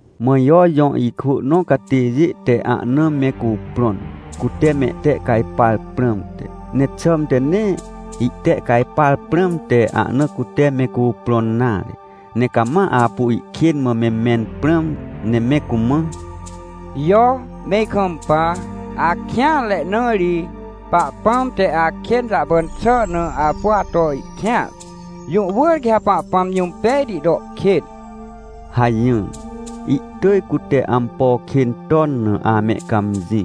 Mã Jo jõ ikwỳ nõ catêjê te ahna me cuprõn, cute mehtehcajpar prãmte. Ne xãmte nee ihtehcajpar prãmte ahna cute me cuprõn nare, ne cama apu ihkên mã me mẽn prãm, ne me cumã: — Jo, me ikampa. Akêanre, na ri Pahpãm te akên jahpan xà na apu ato kêanre. Jũ wỳr quê Pahpãm jũm pejti to kên — hajỹr. Ihtỳj cute ampo kên ton na amehcãmjĩ,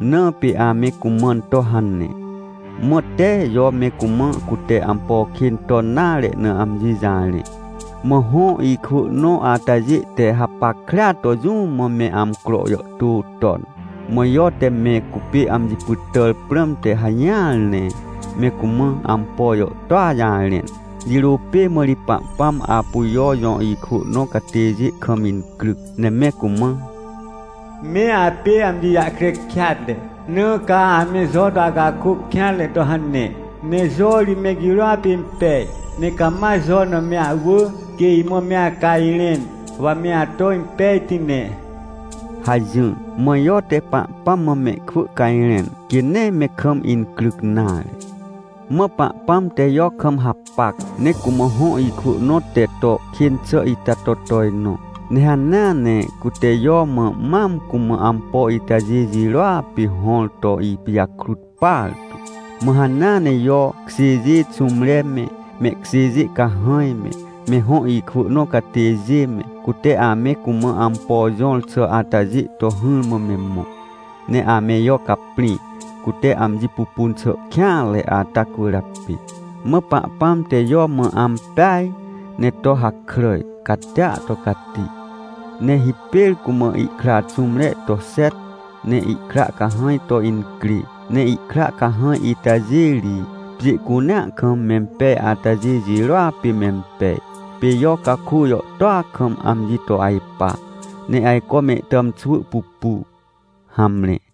na pê ame cumãn to hane. Mã tee Jo me cumã cute ampo kên ton nare na amji jarẽ. Mã hõ ikwỳ nõ atajê te hapackrea to jũ mã me amcro jàhtô ton. Mã Jo te me cupê amji pytàr prãmte hajỹar, ne me cumã ampo jàhtôa jarẽn. Jirô pê mã ri Pahpãm apu Jo jõ ikwỳ nõ catêjê kam incryc, ne me cumã: — Me apê amji jahkre kêatre, na ca ame Jo to acakôc kêanre to hane. Ne Jo ri me girôa pê impej. Ne cama Jo na me ahwỳ, quê imã me acajrẽn, wa me ato impejti ne — hajỹr. Mã Jo te Pahpãm mã mehkwỳ cajrẽn, quê nee me kam incryc nare. Mã Pahpãm te Jo kam hapac, ne cumã hõ ikwỳ nõ te to kên xà ita to tojnõ. Ne hanea ne cute Jo mã mam cumã ampo itajê jirôa pê hõr to ipijakrut partu. Mã hanea ne Jo kjêjê xũmre me, mehkjêjê cahãj me, me hõ ikwỳ nõ catêjê me, cute ame cumã ampo jõr xà atajê to hỹrmã me mõ. Ne ame Jo caprĩ, cute amji pupun xà kêanre ata cwỳrjapê. Mã Pahpãm te Jo mã ampej, ne to hakràj catia to cati, ne hipêr cumã ihkra xũmre to xet, ne ihkra cahãj to incrê, ne ihkra cahãj itajê ri, pjê cunea kam mempej atajê jirôa pê mempej. Pê Jo caku jàhtôa kam amji to ajpa, ne ajco mehtàmxwỳ pupu. Hamre.